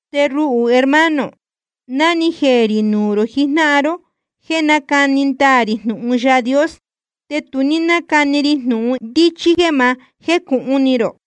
Te ruhū, hermano, ná ni jeē rī nuū rō jijnáhan ró jéē nácani ndaā rī jnūhun Yaā Dios, te tu ní nácani ri jnūhun ndíchí jéē ma jécūhun ni rō.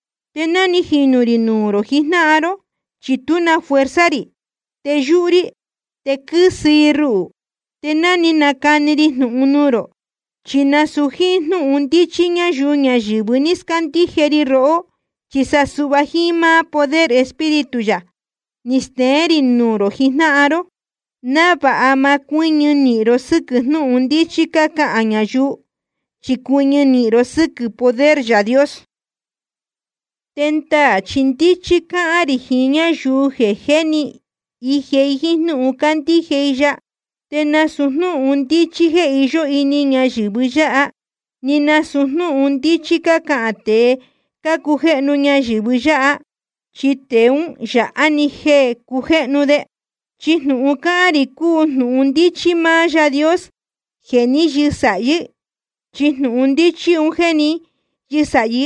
Te ná ni jinū rī nuū rō jijnáhan ró, chi tú na fuerza rī, te yúhú rí, te quɨ́sɨ i ruhū. Te ná ni nacani ri jnūhun nuū rō, chi nasūu jíín jnúhun ndíchí ñáyuu ñayɨ̄vɨ ní scándíje ri rohó, chi sa suhva jiín máá poder Espíritu yā ni steén rī nuū rō jijnáhan ró, návāha ma cuɨ́ñɨ ró sɨ́quɨ̄ jnúhun ndíchí cácahān ñayuu, chi cuɨñɨ ró sɨ́quɨ̄ poder Yaā Dios. Te ndaā chi ndíchí cácahān rī jiín ñáyuu jeē jé ni ije jíín jnúhun cándíje i ya. Te nasūu jnúhun ndíchí jéē iyó ini ñayɨ̄vɨ yáha, ni nasūu jnúhun ndíchí cácahān tēe cácujéhnu ñayɨ̄vɨ yáha, chi tēe ún yāha‑ni jeē cácujéhnu de. Chi jnūhun cácahān rī cúu jnūhun ndíchí máá Yaā Dios jeē ní yɨsāhí. Chi jnūhun ndíchí un jéē ní yɨsāhí,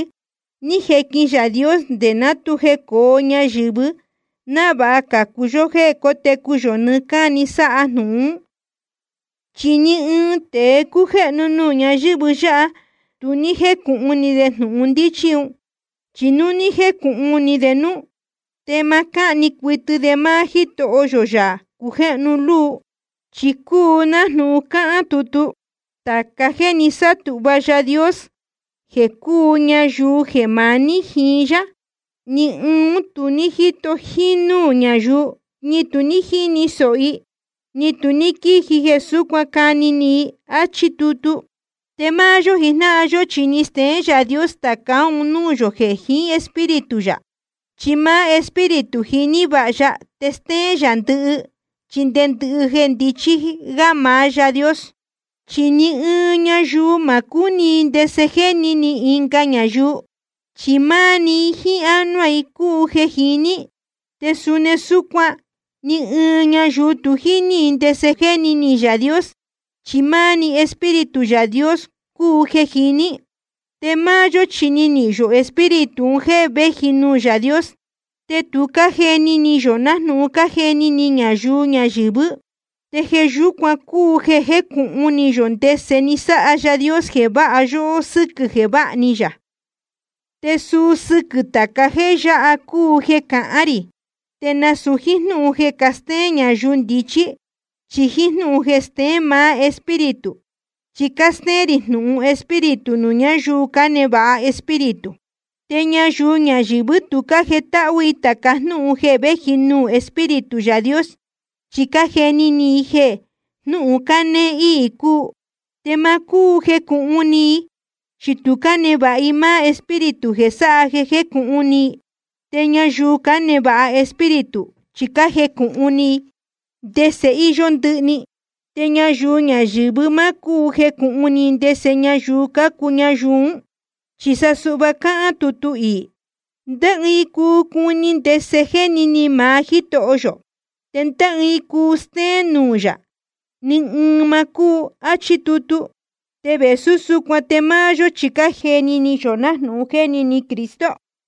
ni jequin Yaā Dios nde ná tu jecōo ñayɨ̄vɨ́, návāha cācu yó jéē cótecu yō nɨɨ́ cáni sáha jnūhun ún. Chi ni ɨɨn tēe cújéhnu nuū ñáyɨ̄vɨ yáha, tu ní jécūhun ni de jnūhun ndíchí un. Chi núu ni jecūhun ni de núú, te ma cáhni cuɨtɨ de máá Jítoho yō, Yaā cujéhnu luu. Chi cúu nájnūhun cáhán tutu: Tāca jéē ni sátūhva Yaā Dios jeē cúu ñayuu jeē maní jiín yá, ni ɨɨn ún tu ní jíto jínúū ñayuu, ni tu ní jíni sōho i, ni tu ní quíji jeē súcuan cani ni i. Achí tutu. Te máá yó jijnáhan yó chi ni steén Yaā Dios tācá un núū yō jeē jiín Espíritu yā. Chi máá Espíritu jiní vāha ya te stéén yā ndɨhɨ, chi nde ndɨhɨ jeē ndichí gá maá Yaā Dios. Chi ni ɨɨn ñayuu ma cúu cuni i ndese jéni ni ɨnga ñayuu, chi máá‑ni i jíín ánuá i cúu jeē jiní. Te suni súcuan ni ɨɨn ñayuu tu jíní i ndese jéni ni Yaā Dios, chi máá‑ni Espíritu Yaā Dios cúu jeē jiní. Te máá yó chi ni nihīn yō Espíritu un jéē véji nuū Yaā Dios, te tu cájeni ni yō nájnūhun cájeni ni ñayuu ñayɨ̄vɨ́. Te jeē yúcuan cúu jeē cájecūhun ni yō ndese ni sáha Yaā Dios jeē váha yóhó sɨ́quɨ̄ jeē váha ni yā. Te suu sɨquɨ̄ tāca jéē yáha cúu jeē cácahān rī, te nasūu jíín jnúhun jeē castéén ñayuu ndichí, chi jíín jnúhun jeē steén maá Espíritu. Chi cástéén rī jnūhun Espíritu nuū ñáyuu cánevāha Espíritu. Te ñayuu ñayɨ̄vɨ́ tu cájetáhú i tāca jnúhun jeē véji nuū Espíritu Yaā Dios, chi cájeni ni i jeē jnúhun cánéé íī cúu. Te ma cúu jecūhun ni i, chi tu cánevāha i máá Espíritu jeē sáha jeē jécūhun ni i. Te ñayuu cánevāha Espíritu, chi cájecūhun ni i ndese íyó ndɨhɨ‑ni. Te ñayuu ñayɨ̄vɨ́ ma cúu jecūhun ni i ndese ñayuu cácuu ñayuu ún. Chi suhva cáhán tutu iī: ¿Ndé ɨɨn cuu cuni ndese jéni ni maá Jítoho yō? ¿Te ndé ɨɨn cuu stéén nuū yā? Ni ɨɨn ma cúu. Achí tutu. Te vēsú súcuan te máá yó chi cájeni ni yō nájnūhun jéni ni Cristo.